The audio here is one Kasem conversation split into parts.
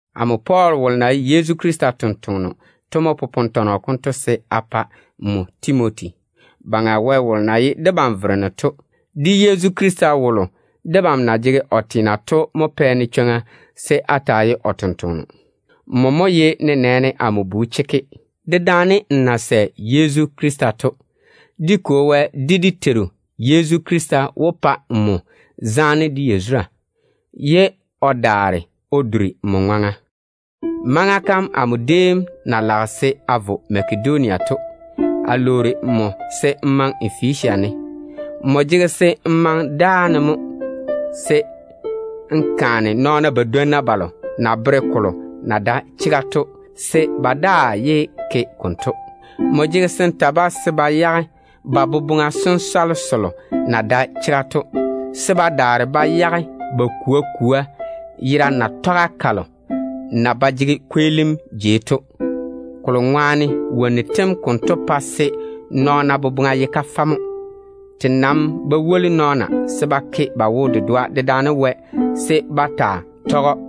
Amo Pɔɔl wolo na ye Yezu Krista totoŋa nakwe to mo popone tɔnɔ konto se a pa nmo Timoti. Baŋa Wɛ wolo na ye debam Vereno to, de Yezu Krista wolo debam na jege o teena to mo pɛ-ne chwoŋa se a taa ye o tontoŋeno. Nmo mo ye nenɛɛne amo bu chekke, dedaane n na sɛ Yezu Krista to. Dé Kwo Wɛ, de dé Teiru Yezu Krista wó pa nmo zaane de yazura, ye o daare o duri nmo ŋwaŋa. Maŋa kam amo déem na lage se a vo Makedonia to, a lwoori nmo se n maŋe Efesia ne. Nmo jege se n maŋe dáane mo, se n kaane nɔɔna badwonna ba na jege vwa ba bere nɔɔna to se ba yage ba bera yam. N jege se n ta-ba se ba yage ba boboŋa sensɔle selo na dae chega to, se ba daare ba yage ba kwoa kwoa yera natɔga kalo na ba jege kweelim jei to. Kolo ŋwaane wonnu tem konto pae se nɔɔna boboŋa ye kafɛ mo. Te nam ba woli nɔɔna se ba ke ba wo-dedoa dedaane Wɛ se ba taa tɔge‑o.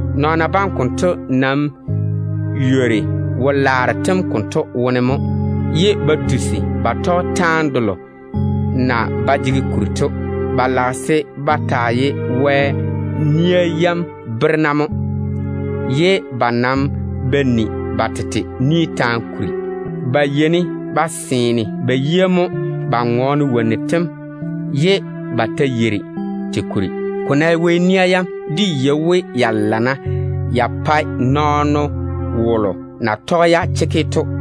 Nɔɔna bam konto nam ywori wo-laaro tem konto wone mo, ye ba tusi ba tɔge taane delo na ba jege kuri to. Ba lage se ba taa ye Wɛ nia yam berena mo, ye ba nam ba ni ba tete ni taane kuri. Ba yeini ba seene ba yia mo ba ŋɔɔne wonnu tem, ye ba ta yeiri te kuri. Ko ná ye Wɛ nia yam, dé yei we ya lana ya pae nɔɔno wolo maama na tɔge-ya chekke to.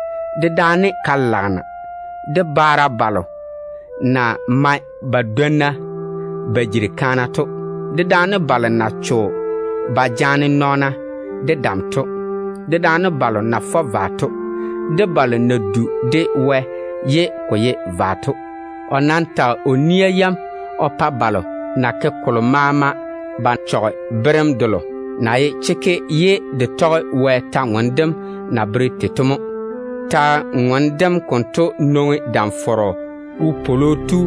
dedaane balo na bwoori to, de baara balo na mae ba dwonna ba jiri kaana to, dedaane balo na cho ba jaane nɔɔna de dam ba yeigi to, dedaane vwa-fɔra, de balo na du de Wɛ ye ko dae chega to ŋwaane. O nam tage o ni-kaana yam o pa balo na ke kolo maama ba chɔge berem delo na ye chekke ye de tɔge Wɛ kwor-ywoŋa kam na bere tei to mo. Kwor-ywoŋa kam konto nwoŋi Ywoni Tu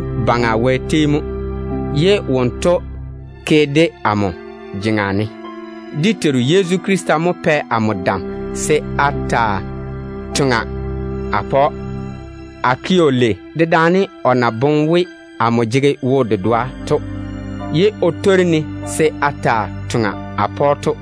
Wɛ tei mo, ye wonto mo kwei-ka o ke amo jeŋa ne se a taa tɛa. Dé Teiru Yezu Krista mo pɛ amo dam se a taa toŋa a pa‑o. A ke‑o lei dedaane o na boŋe we amo jege wo-dedoa, ye o le-ne o zege o totoŋa yam baŋa ne to.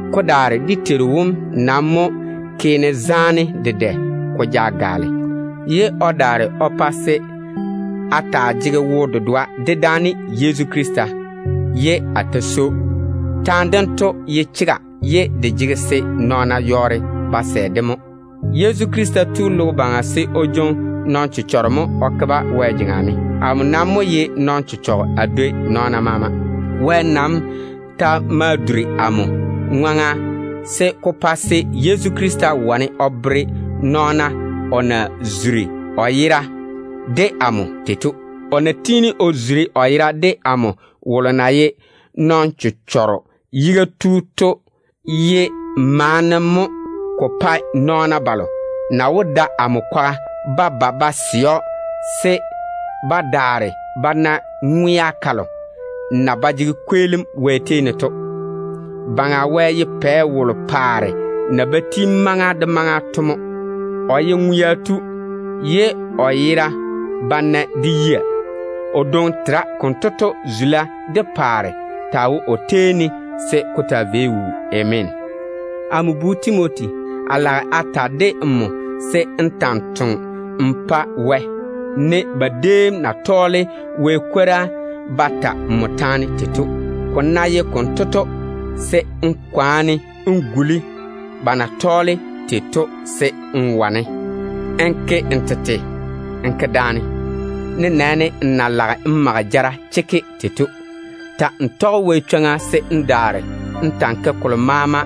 Ko daare dé Teiru wom nam mo ke-ne zaane dedɛ ko ja gaale, ye o daare o pa se a taa jege wo-dedoa dedaane Yezu Krista, ye a swoi‑o. Taane dento ye chega ye de jege se nɔɔna yɔɔre ba sɛ-de mo: “Yezu Krista tu logo baŋa se o jwoŋi nɔn-chechɔgero mo o daare o ke-ba Wɛ jeŋa ne.” Amo nam mo ye nɔn-chechɔgɔ a dwoi nɔɔna maama. Wɛ nam ta ma duri amo ŋwaŋa se ko pore chwoŋa se Yezu Krista wane o tɔge-ka o bere nɔɔna o na zuri o yera de amo tei to. O tiini o zuri o yera de amo wolo na ye nɔn-chechɔgero tem yiga tu to. Ko maa ye maana ko pae nɔɔna balo na wó da amo kwaga ba ba ba sɛ‑o se ba daare ba na ŋwea kalo na ba jege kweelim Wɛ tei ne to. Baŋa Wɛ ye pɛ wolo paare na bá ti maŋa de maŋa to mo. O ye ŋwea tu, ye o yera ba nae de yia. O dwoŋi tera. Konto to, zula de paare taa wo o tei ne se ko taa vei wuu. Ameena. Amo bu Timoti, a lage a ta de nmo se n ta‑n toŋe n pa Wɛ, ne ba déem na tɔɔle Wɛ kwora ba ta nmo taane tei to. Ko na ye konto to, se n kwaane n guli ba na tɔɔle tei to se n wane n ke n tete n ke daane, nenɛɛne n na lage n jaŋe jaŋa chekke tei to. Ta‑n tɔge Wɛ chwoŋa se n daare n ta‑n ke kolo maama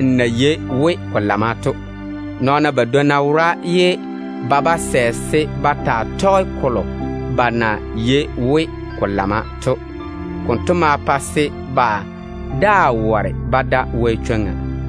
n na yei we ko lamma to. Nɔɔna badwonna wora ye ba ba sɛ se ba taa tɔge kolo ba na yei we ko lamma to. Konto ma pa se ba daa ware ba da Wɛ chwoŋa.